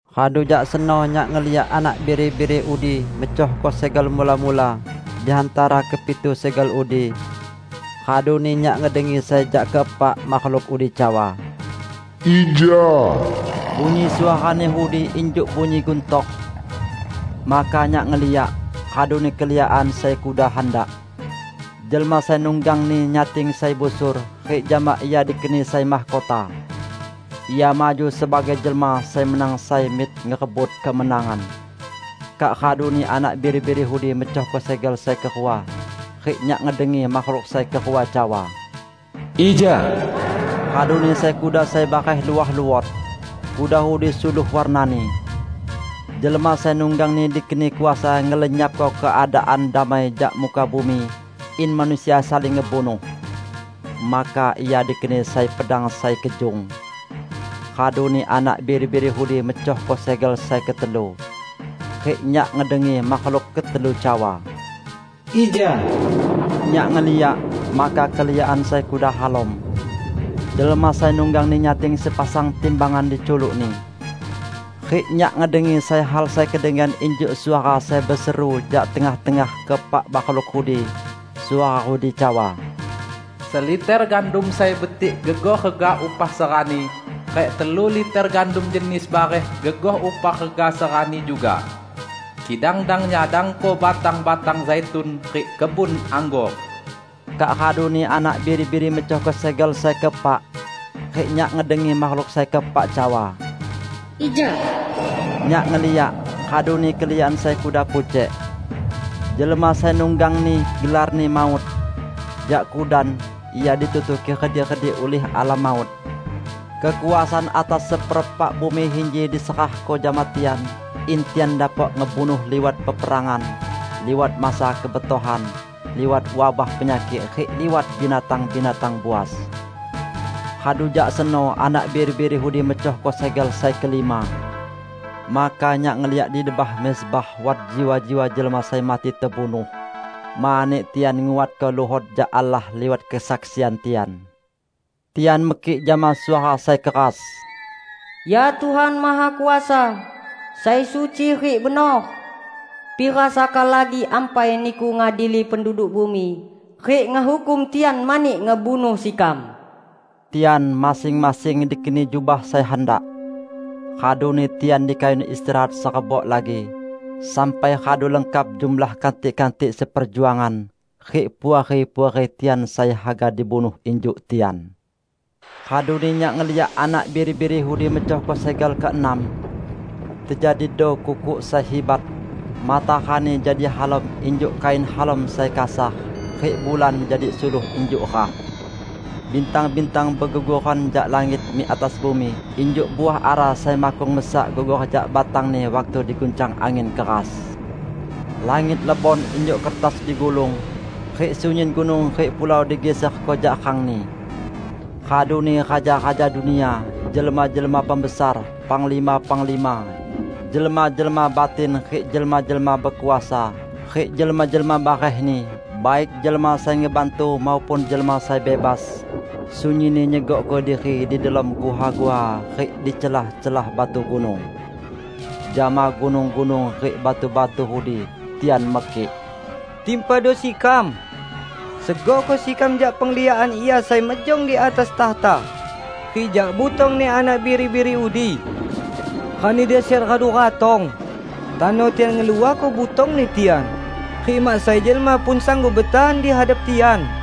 Radu jak seno nyak ngeliak Anak Biri-biri udi mecohko segel mula-mula di hantara kepitu segel udi. Raduni nyak ngedengi sai jak keepak makhluk udi cawa, "Ija!" Bunyi suarani udi injuk bunyi guntor. Maka nyak ngeliak, raduni keliakan sai kuda handak. Jelma sai nunggangni nyating sai busur, rik jama ia dikeni sai mahkota. Ia maju sebagai jelma sai menang sai mik ngerebut kemenangan. Kak raduni Anak Biri-biri udi mecohko segel sai kerua, rik nyak ngedengi makhluk sai kerua cawa, "Ija!" Raduni sai kuda sai bareh luah luot. Kuda udi suluh warnani. Jelma sai nunggangni dikeni kuasa ngelenyapko keadaan damai jak muka bumi, in manusia saling ngebunuh. Maka ia dikeni sai pedang sai kejung. Raduni Anak Biri-biri udi mecohko segel sai ketelu. Rik nyak ngedengi makhluk ketelu cawa, "Ija!" Nyak ngeliak, maka keliakan sai kuda halom. Jelma sai nunggangni nyating sepasang timbangan di culukni. Rik nyak ngedengi sai hal sai kedengian injuk suara sai beseru jak tengah-tengah keepak makhluk udi. Suara udi cawa, "Seliter gandum sai betik gegoh rega upah serani, rik telu liter gandum jenis bareh gegoh upah rega serani juga. Kidang dang nyadangko batang-batang zaitun rik kebun anggor!" Kak raduni Anak Biri-biri mecohko segel sai keepak. Rik nyak ngedengi makhluk sai keepak cawa, "Ija!" Nyak ngeliak, raduni keliakan sai kuda pucek. Jelma sai nunggangni gelarni Maut. Jak kudan, ia ditutuki redik-redik ulih Alam Maut. Kekuasaan atas seperepak bumi inji diserahko jama tian, in tian dapok ngebunuh liwat peperangan, liwat masa kebetohan, liwat wabah penyakik rik liwat binatang-binatang buas. Radu jak seno Anak Biri-biri udi mecohko segel sai kelima. Maka nyak ngeliyak di debah mezbah wat jiwa-jiwa jelma sai mati tebunuh mani tian nguatko luhot jak Allah liwat kesaksian tian. Tian mekik jama suara sai keras, "Ya Tuhan Mahakuasa, sai suci rik benor! Pira saka lagi ampai Niku ngadili penduduk bumi rik ngehukum tian mani ngebunuh sekam?" Tian masing-masing dikeni jubah sai handak. Raduni tian dikayun istirahat serebok lagi, sampai radu lengkap jumlah kantik-kantik seperjuangan rik puari-puari tian sai haga dibunuh injuk tian. Raduni nyak ngeliyak Anak Biri-biri udi mecohko segel keenam. Tejadido kukuk sai hibat. Matarani jadi halom injuk kain halom sai kasar, rik bulan jadi suluh injuk rah. Bintang-bintang begugoran jak langit mik atas bumi injuk uah ara sai makkung mesak gugor jak batangni waktu diguncang angin keras. Langit lebon injuk kertas digulung, rik sunyin gunung rik pulau digiserko jak rangni. Raduni raja-raja dunia, jelma-jelma pembesar, penglima-penglima, jelma-jelma batin rik jelma-jelma bekuasa, rik jelma-jelma barehni, baik jelma sai ngebantu maupun jelma sai bebas, sunyinni nyegokko diri di delom guha-guha rik di celah-celah batu gunung. Jama gunung-gunung rik batu-batu udi, tian mekik, "Timpado sekam! Segokko sekam jak pengliakan Ia sai mejong di atas takhta, rik jak butong-Ni Anak Biri-biri udi. Rani dasyat radu ratong, tano tian ngeluahko butongni tian, rik mak sai jelma pun sanggup betahan di hadap tian!"